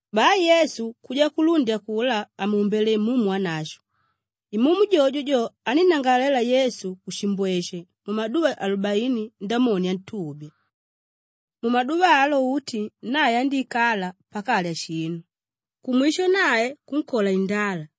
Bai Yesu kuja kulundi akulá àmuumbele Imumu Wanashwe. Imumu jojo jo anínnangalalela Yesu kushimbweshe mumaduva alubaini Ndamoni antubya. Mumaduva alo uti nae andíikala pakalya shinu; kumwisho nae kunkola indala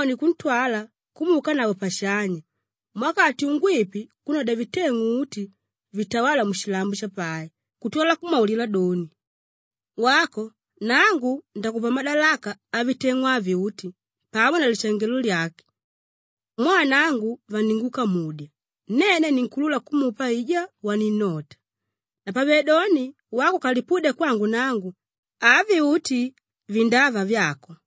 Ndamoni kuntwala kumuukanavo pashanya, muwakati ungwipi kunnodya viteng'u uti vitawála mushilambo shapai kutwala kumwaulila doni, “Wako nangu ndakupa madalaka aviteng'u avi uti pamo na lishangelo lyake mwaa nangu vaningukamudya, nene ninkuulula kumupa aijá waninnota. Napavedoni wako ukalipudya kwangu nangu, avi uti vindava vyako.”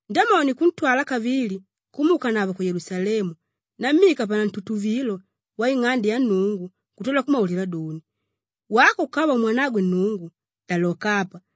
Ndamoni kuntwala kavili kumuukanavo ku Yelusalemu nammika panantutuvilo waing'ande ya Nnungu kutwala kumwaulila doni, “Wako ukava umwanagwe Nnungu, daloka apa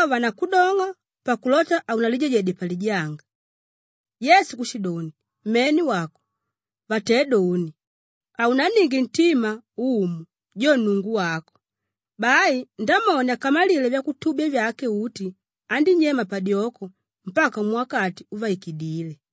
vanavo vandakudong'a pakulota haunalijajede palijanga.” Yesu kushidoni, “Mene wako! Vatédoni, ‘Haunanninge ntima Umu, jo Nnungu wako.’” Bai Ndamoni akamalile vyakutubya vyake uti, andínyema padyoko mpaka muwakati uvaikidíle.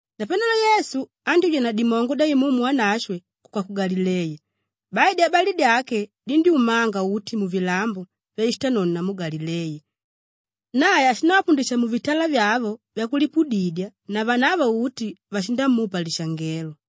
Napanelo Yesu andyúja na dimongo dya Imumu Wanashwe kuka ku Galileya. Bai dyabali dyake dindyúmanga uti muvilambo vyashitanono namu Galileya. Nae ashindavapundisha muvitala vyavo vyakulipudidya na vanavo uti vashindamupa lishangelo.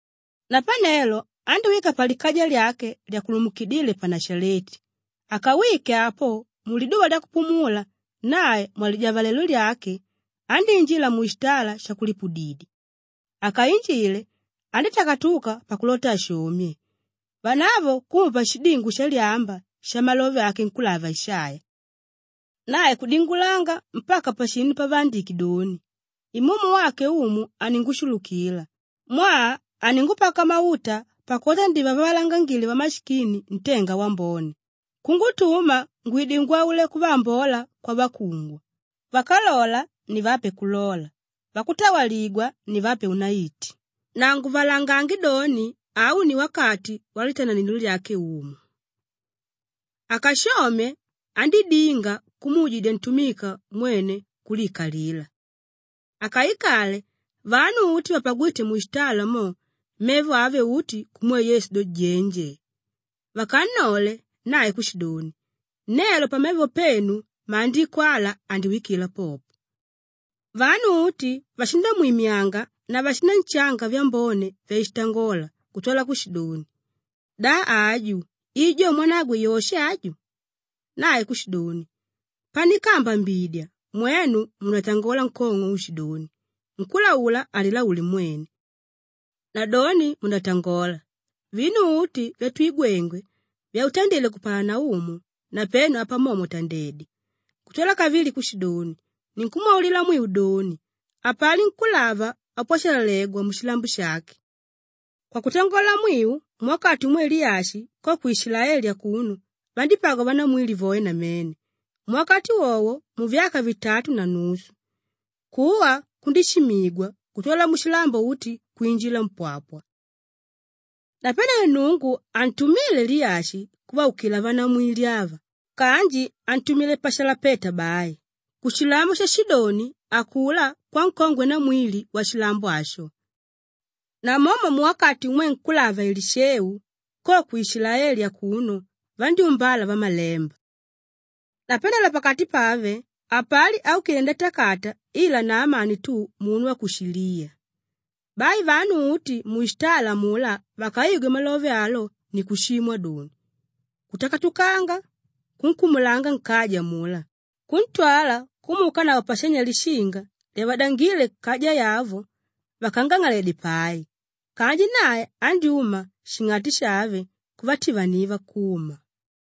Napanelo andíwika palikaja lyake lyakulumukidile pa Nashaleti; akawike apo, muliduva lyakupumula nae mwalidyavalelo lyake, andíinjila mushitala shakulipudidya. Akainjile, andítakatuka pakulota ashomye; vanavo kumupa shidingo shalyamba shamalove ake nkúlava Ishaiya. Nae kudingulanga mpaka pashinu pavaandike doni, “Imumu wake Umu aningushulukila mwaa aningupaka mauta pakulota ndivavalangangile vamashikini ntenga wambone, kungutuma ngwide ngwaule kuvaambola kwavakungwa, vákalola nivape kulola, vakutawaligwa nivape unaiti na nguvalangange doni, au ni wakati walitananilo lyake Umu.” Akashomye, andídinga kumuujidya ntumika mwene kuliikalila. Akaikale, vanu uti vapagwíte mushitala mo, mevo ave uti kumwe Yesu do, jenje. Vakannole, nae kushidoni, “Nelo pamevo penu Maandiko ala andiwikila popo.” Vanu uti vashindamwimyanga na vashinanshanga vyambone vyashitangola kutwala kushidoni, “Da aju i jo mwanagwe Yoshe aju?” Nae kushidoni, “Panikaambambidya mwenu mundatangola nkong'o uushidoni, ‘Nkúlaula alilaule mwene!’ Nadoni mundatangola, ‘Vinu uti vyatwigwenge, vyautandile ku Kapalanaumu napenu apa momo tandedya!’” Kutwala kavili kushidoni, “Ninkumwaulila mwiu doni, hapali nkúlava ápwashalalegwa mushilambo shake. Kwakutangola mwiu muwakati umwe Liyashi, ko ku Ishilaeli akuno vandípagwa vanamwili voe namene; muwakati wowo muvyaka vitatu na nusu, kuwa kundishimigwa kutwala mushilambo uti kwinjila mpwapwa. Napanelo Nnungu hantumíle Liyashi kuvaukila vanamwili ava kanji antumile pa Shalapeta bai, kushilambo sha Shidoni akulá kwankongwe namwili washilambo asho. Namomo muwakati umwe nkúlava Elisheu, ko ku Ishilaeli akuno vandyúmbala vamalemba. Napanelo pakati pave, hapali áukile ndatakata ila Naamani tu munu wa ku Shiliya!” Bai vanu uti mushitala amulá vakaigwe malove alo ni kushimwa doni, kutakatukanga kunkumulanga nkaja amulá, kuntwala kumuukanavo pashanya lishinga lyavadangíle kaja yavo vakangang'aledye pai. Kanji nae andyúma shing'ati shave kuvativaniva kuma.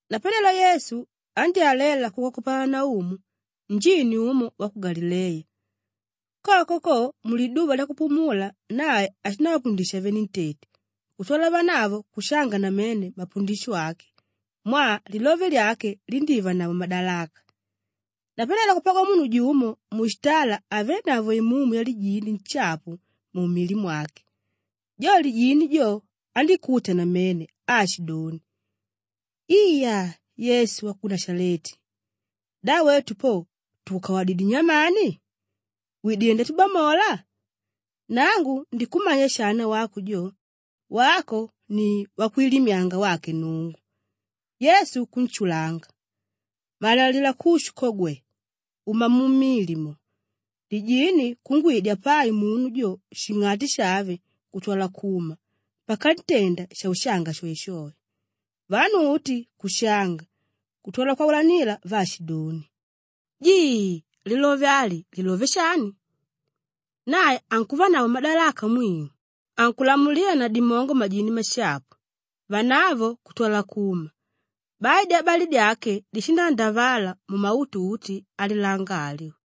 Napanelo Yesu andyálalela ku Kapalanaumu njini umo wa ku Galileya. Koko ko muliduva lyakupumula nae ashindavapundisha venentete kutwala vanavo kushanga namene mapundisho ake mwaa lilove lyake lindívanavo madalaka. Napanelo kupagwa munu jumo mushitala ávenavo imumu yalijini nshapu mumili mwake. Jo lijini jo, andíkuta namene aashidoni, “Iya! Yesu wa ku Nashaleti, da wetu po tukukawadidyé nyamani? Widilé ndatubamola? Nangu ndikumanya shana wako jo. Wako ni Wakwilimyanga wake Nnungu.” Yesu kunshulanga, “Malalila kushu ko gwe! Uma mumili mo!” Lijini kungwidya pai munu jo shing'ati shave kutwala kuma pakantenda shaushanga shoeshoe. Vanu uti kushanga kutwala kwaulanila vaashidoni, “Jii, lilove ali, lilove shani? Nae ankuvanavo madalaka mwiu, ankulamulila na dimongo majini mashapu, vanavo kutwala kuma!” Bai dyabali dyake dishindaandavala mumautu uti alilanga alyo.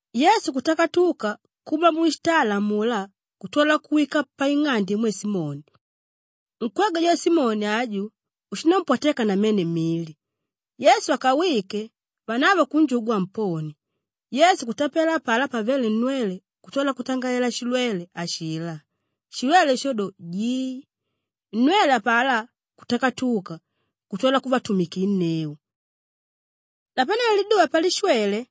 Yesu kutakatuka kuma mushitala amulá kutwala kuwika paing'ande imwe Simoni; nkwegwe jo Simoni aju, ushínampwateka namene mili. Yesu akawike, vanavo kunjugwa amponie. Yesu kutapela apalá pavele nnwele kutwala kutangalela shilwele ashilá; shilwele sho do, jii. Nnwele apalá kutakatuka kutwala kuvaatumikinneu. Napanelo liduva palishwele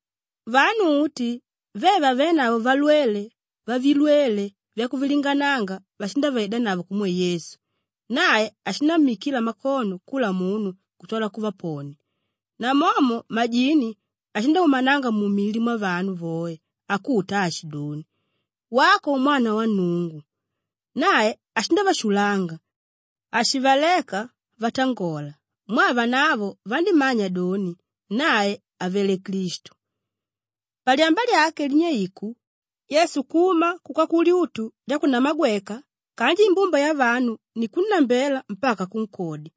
vanu uti ve vavénavo valwele vavilwele vyakuvilingananga vashindavaidanavo kumwe Yesu. Nae ashinammikila mikono kula munu kutwala kuvaponia. Namomo majini ashindaumananga mumili mwavanu voe akuta aashidoni, “Wako, umwana wa Nnungu!” Nae ashindavashulanga, hashivaleka vatangola mwaa vanavo vanímmanya doni, nae avele Klistu. Palyamba lyake, linyeiku, Yesu kuma kuka kulyutu lyakunamagweka kanji imbumba yavanu ni kunnambela mpaka kunkodya.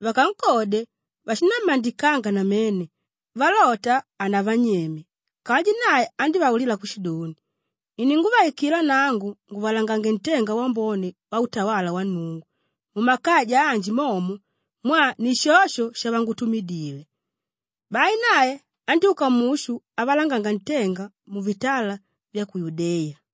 Vakankodye, vashinammandikanga namene valota hanavanyeme kanji nae andívaulila kushidoni, “Ininguvaikila nangu nguvalangange ntenga wambone wautawala wa Nnungu mumakaja anji momo mwaa ni shosho shavangutumidile.” Bai nae andyúka mushu avalanganga ntenga muvitala vya ku Yudeya.